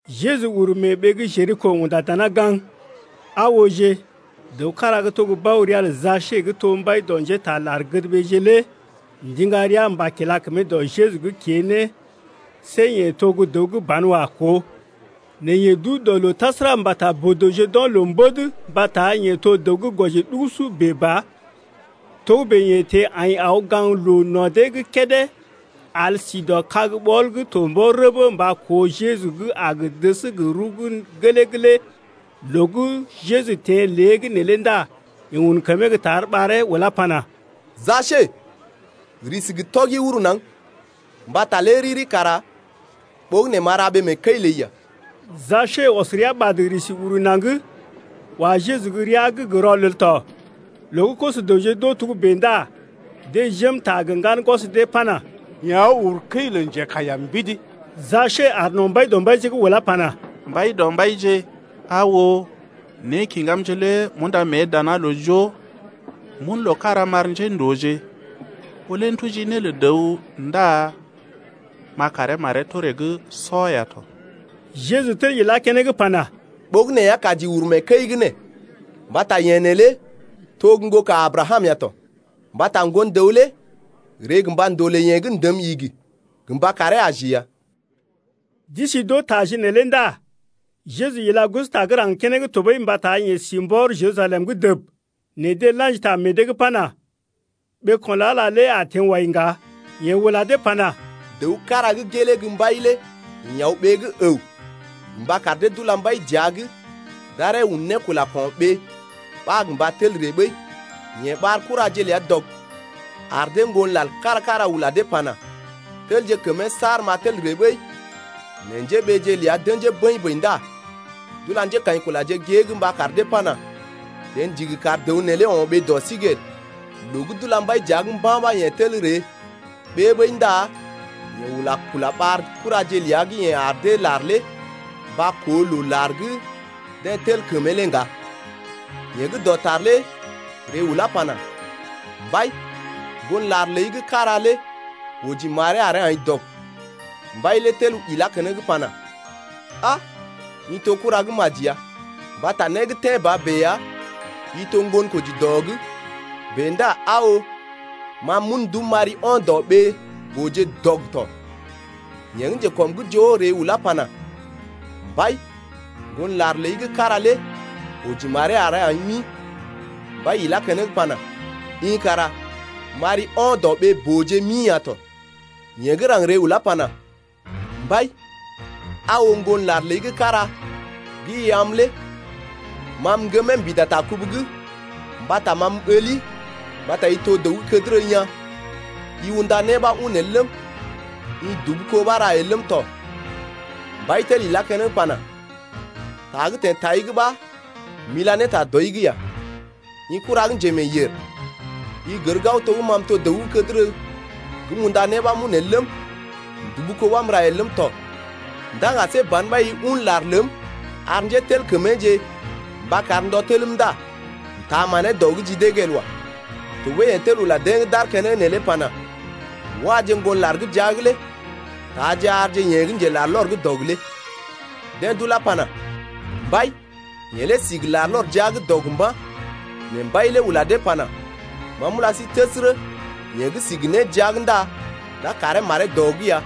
Jeju uru mee ɓee gə́ Jeriko unda dana gaŋg. Aa ooje, dəw kára gə́ to bao ria lə Jasee gə́ to mbai dɔ njétaa lar-gədɓeeje lé ndiŋga rəa mba kila kəmee dɔ Jeju’g kée ne see yeḛ to gə́ dəw gə́ banwa koo, nɛ yeḛ duu dɔ loo tasəra mbata boo-dəwje d’o̰ loo mbèd mbata yeḛ to dəw gə́ gwɔji ɗugusu bèe ba. Togə́bè yeḛ teḛ aḭ aw gaŋg loo no̰ dee’g kédé al sí dɔ kag-ɓɔl gə́ to mbɔr rəbə mba koo Jeju gə́ a gə dəs gə rəw gə́ gelee’g lé. Loo gə́ Jeju teḛ lée’g neelé ndá yeḛ un kəmee gə́ tar ɓaree ulá pana: Jasee, risi gə́ tɔgi uru naŋg, mbata lé riri kara ɓogənè m’a ra ɓee mee kəi ləi ya. Jasee ɔs rəa ɓad risi uru naŋg, wa Jeju gə́ rəa’g gə rɔlel tɔ. Loo gə́ koso-dəwje d’oo togə́bè ndá deḛ jém ta gə ŋgan gwɔs dee pana: Yeḛ aw uru kəi lə njekaiya mbidi. Jasee aar no̰ Mbaidɔmbaije’g ulá pana: Mbaidɔmbaije, aa oo, nékiŋgamje lé m’unda mée dana loo joo m’un loo kára m’ar njéndooje, ɓó lé m’tuji né lə dəw ndá m’a karee maree toree’g sɔ ya tɔ. Jeju tel ilá keneŋ pana: Ɓogənè ya kaji uru mee kəi’g nee mbata yeḛ neelé to gə́ ŋgoka Abrakam ya tɔ. Mbata Ŋgon-dəw lé ree gə mba ndolè yeḛ gə́ ndəm igi gə mba karee aji ya. D’isi d’oo taje neelé ndá Jeju ila gosota gə́ raŋg keneŋ tɔɓəi mbata yeḛ si mbɔr Jerusalem’g dəb, nɛ deḛ la̰ji ta meḛ dee’g pana: Ɓeeko̰ lə Ala lé a teḛ wai ŋga. Yeḛ ula dee pana: Dəw kára gə́ gelee gə́ mbai lé ḭ aw ɓee gə́ əw gə mba kar dee d’ula mbai dəa’g d’aree un ne kula ko̰ɓee ɓa gə mba tel ree ɓəi. Yeḛ ɓar kuraje ləa dɔg, ar dee ŋgon lar kára-kára ula dee ne pana: Telje kəmee saar m’a tel ree ɓəi. Nɛ njéɓeeje ləa d’ə̰jee bəḭ-bəḭ ndá d’ula njékaḭkulaje gée’g mba kar dee pana: Jeḛ ndigi kar dəw neelé o̰ ɓee dɔ sí’g el. Loo gə́ d’ula mbai dəa’g mba̰ ɓa yeḛ tel ree ɓée ɓəi ndá yeḛ ula kula ɓar kuraje ləa gə́ yeḛ ar dee lar lé mba koo loo lar gə́ deḛ tel kəmee lé ŋga. Yeḛ gə́ dɔtar lé ree ulá pana: Mbai, ŋgon lar ləi gə́ kára lé oji maree aree aḭ dɔg. Mbai lé tel ilá keneŋ pana: A! i to kura gə́ maji ya, mbata né gə́ tḛ́ ba bèe ya i to ŋgonkoji dɔ’g bèe ndá aa oo, ma m’un ndum m’ari ɔn dɔ ɓee-booje’g dɔg tɔ. Yeḛ gə́ njekɔm’g joo ree ulá pana: Mbai ŋgon lar ləi gə́ kára lé oji maree aree aḭ mi. Mbai ila keneŋ pana: I kara m’ari ɔn dɔ ɓee-booje’g mi ya tɔ. Yeḛ gə́ raŋg ree ulá pana: Mbai, aa oo, ŋgon lar ləi gə́ kára gə́ i am lé ma m’ŋgəm mbida ta kubu’g, mbata ma m’ɓəli mbata i to dəw gə́ kədərə yaa̰, i unda né ɓa un el ləm, i dubu kó ɓa ra el ləm tɔ. Mbai tel ilá keneŋ pana: Ta gə́ teḛ tai’g ɓa m’ila ne ta dɔi’g ya, i kura gə́ njemeeyèr. I gər gao to gə́ ma m’to gə́ dəw gə́ kədərə gə́ m’unda né ɓa m’un el ləm, m’dubu kó ɓa m’ra el ləm tɔ ndá ŋga see ban ɓa i un lar ləm ar njételkəmeeje gə mba kar ndɔ telm ndá m’taa manee dɔ’g ji dee’g el wa. Tɔɓəi yeḛ tel ula deḛ gə́ d’aar keneŋ neelé pana: Wáje ŋgon lar gə́ jia’g lé taaje arje yeḛ gə́ njelarlɔr gə́ dɔg lé. Deḛ d’ulá pana: Mbai, yeḛ lé si gə larlɔr jia’g dɔg mba̰. Nɛ mbai lé ula dee pana: Ma m’ula sí təsərə, yeḛ gə́ si gə né jia’g ndá d’a karee maree dɔ’g ya,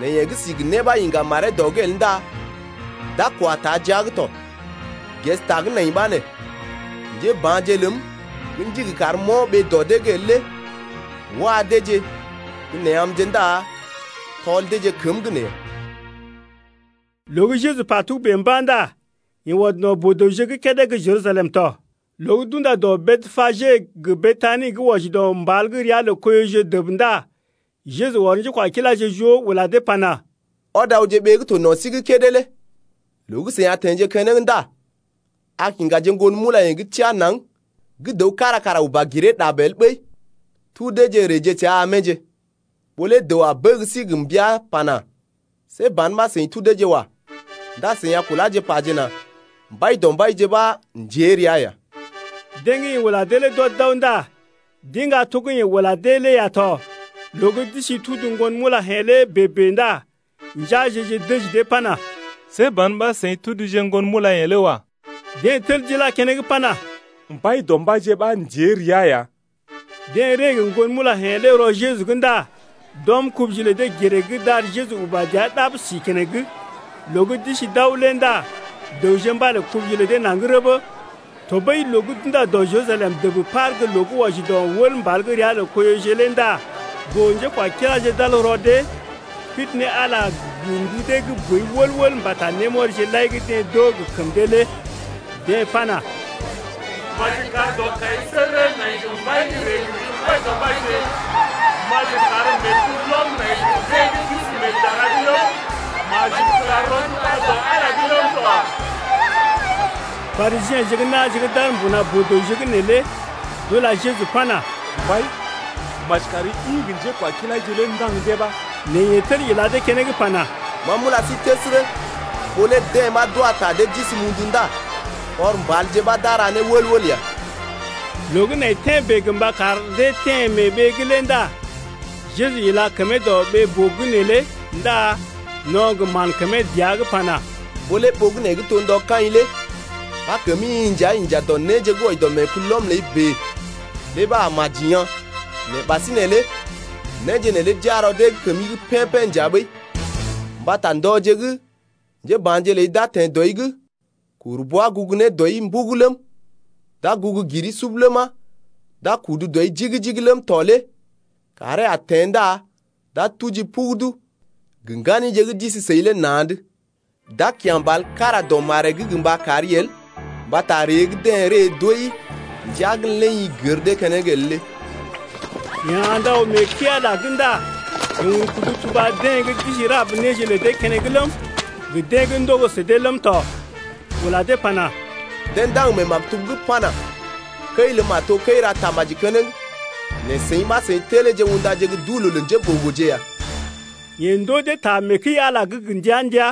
nɛ yeḛ gə́ si gə né ɓa iŋga maree dɔ’g el ndá d’a kwa taa jia’g tɔ. Ges ta gə́ nai ɓa nee: Njéba̰je ləm gə́ ndigi karm m’o̰ ɓee dɔ dee’g el lé wa deeje gə́ nee amje ndá tɔl deeje kəm’g nee ya. Loo gə́ Jeju pa togə́bè mba̰ ndá yeḛ ɔd no̰ boo-dəwje’g kédé gə́ Jerusalem tɔ. Loo gə́ d’unda dɔ Betpage gə Betani gə́ wɔji dɔ mbal gə́ ria lə Koiyoje dəb ndá Jeju ɔr njékwakiláje joo ula dee pana: Ɔd awje ɓee gə́ to no̰ sí’g kédé lé. Loo gə́ seḭ a teḛje keneŋ ndá a kiŋgaje ŋgon mulayḛ̀je gə́ teá naŋg gə́ dəw kára kara uba giree ɗab el ɓəi, tudeeje reeje səa amje. Ɓó lé dəw a bəg sí gə mbəa pana: See ban ɓa seḭ tudeeje wa. Ndá seḭ a kuláje pajena: Mbaidɔmbaije ɓa aw ndée ya. Deḛ gə́ yeḛ ula dee lé d’ɔd d’aw ndá d’iŋga to gə́ yeḛ ula dee lé ya tɔ. Loo gə́ d’isi tudu ŋgon mulayḛ̀je lé bèe-bèe ndá njeaje-je dəji dee pana: See ban ɓa seḭ tuduje ŋgon mulayḛ̀je lé wa. Deḛ tel d’ila dee keneŋ pana: Mbaidɔmbaije ɓa aw ndée ya. Deḛ ree gə ŋgon mulayḛ̀je lé rɔ Jeju’g ndá d’ɔm kubuje lə dee giree’g d’ar Jeju uba dəa ɗab si keneŋ. Loo gə́ d’isi d’aw lé ndá dəwje mbalé kubuje lə dee naŋg rəbə. Tɔɓəi loo gə́ d’unda dɔ Jerusalem dəb par gə́ loo gə́ wɔji dɔ wəl mbal gə́ ria lə Koiyoje lé ndá boo-njékwakiláje d’al rɔ dee, pidi ne Ala gə ndu dee gə́ boi wəl-wəl mbata némɔrije lai gə́ deḛ d’oo gə kəm dee lé. Deḛ pana: Maji kar dɔkaisəgərə nai gə mbai gə́ ree gə ri Mbaidɔmbaije. Maji kar meekulɔm nai gə deḛ gə́ d’isi mee dara’g ləm, maji kula rɔnduba dɔ Ala’g ləm tɔ. Parisiḛje gə́ na̰je gə́ d’aar mbuna boo-dəwje’g neelé d’ula Jeju pana: Mbai, maji kari ḭ gə njékwakilaije lé ndaŋg dee ɓa. Nɛ yeḛ tel ila dee keneŋ pana: Ma m’ula sí təsərə, ɓó lé deḛ ɓa d’wa ta dee d’isi mundu ndá kɔr mbalje ɓa d’a ra né wəl-wəl ya! Loo gə́ nai tḛ́ bèe gə mba kar dee teḛ mee ɓee’g lé ndá Jeju ila kəmee dɔ ɓee-boo’g neelé ndá no̰ gə mán kəmee dəa’g pana: Ɓó lé ɓogənè gə́ to ndɔ kaḭ lé ɓa kəmi-i nja inja dɔ néje gə́ wɔji dɔ meekulɔm ləi bèe lé ɓa a maji yaa̰. Nɛ ɓasinè lé néje neelé d’iya rɔ dee kəmi’g pḛ́-pḛ́ nja ɓəi. Mbata ndɔje gə́ njéba̰je ləi d’a teḛ dɔi’g kuru bwa gugu ne dɔi sub ləm, d’a gugu giri sub ləma, d’a kudu dɔi jigi-jigi ləm tɔ lé kàree a teḛ ndá d’a tujii pugudu gə ŋganije gə́ d’isi səi lé na̰’d. D’a kya̰ mbal kára dɔ maree’g gə mba kari el mbata ree gə́ deḛ ree d’ooi ndəa gən lé i gər dee keneŋ el lé. Yeḛ andə aw mee kəi-Ala’g ndá yeḛ un kudu tuba deḛ gə́ d’isi rab néje lə dee keneŋ ləm, gə deḛ gə́ ndogo sə dee ləm tɔ, ula dee pana: Deḛ ndaŋg mee maktub’g pana: Kəi ləm a to kəi-ra-tamaji keneŋ. Nɛ seḭ ɓa seḭ teleeje undaje gə́ duu-loo lə njéɓogoje ya. Yeḛ ndoo dee ta mee kəi-Ala’g gə ndəa-ndəa.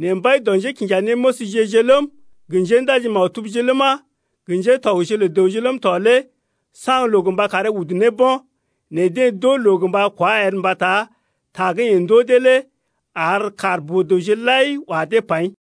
Nɛ mbai dɔ njékinjanéməsje-je ləm, gə njéndaji-maktubje ləma, gə ŋgatɔgje lə dəwje ləm tɔ lé saŋg loo gə mba karee udu ne bo̰. Nɛ deḛ d’oo loo gə mba kwá el mbata ta gə́ yeḛ ndoo dee lé ar kaar boo-dəwje lai wa dee paḭ.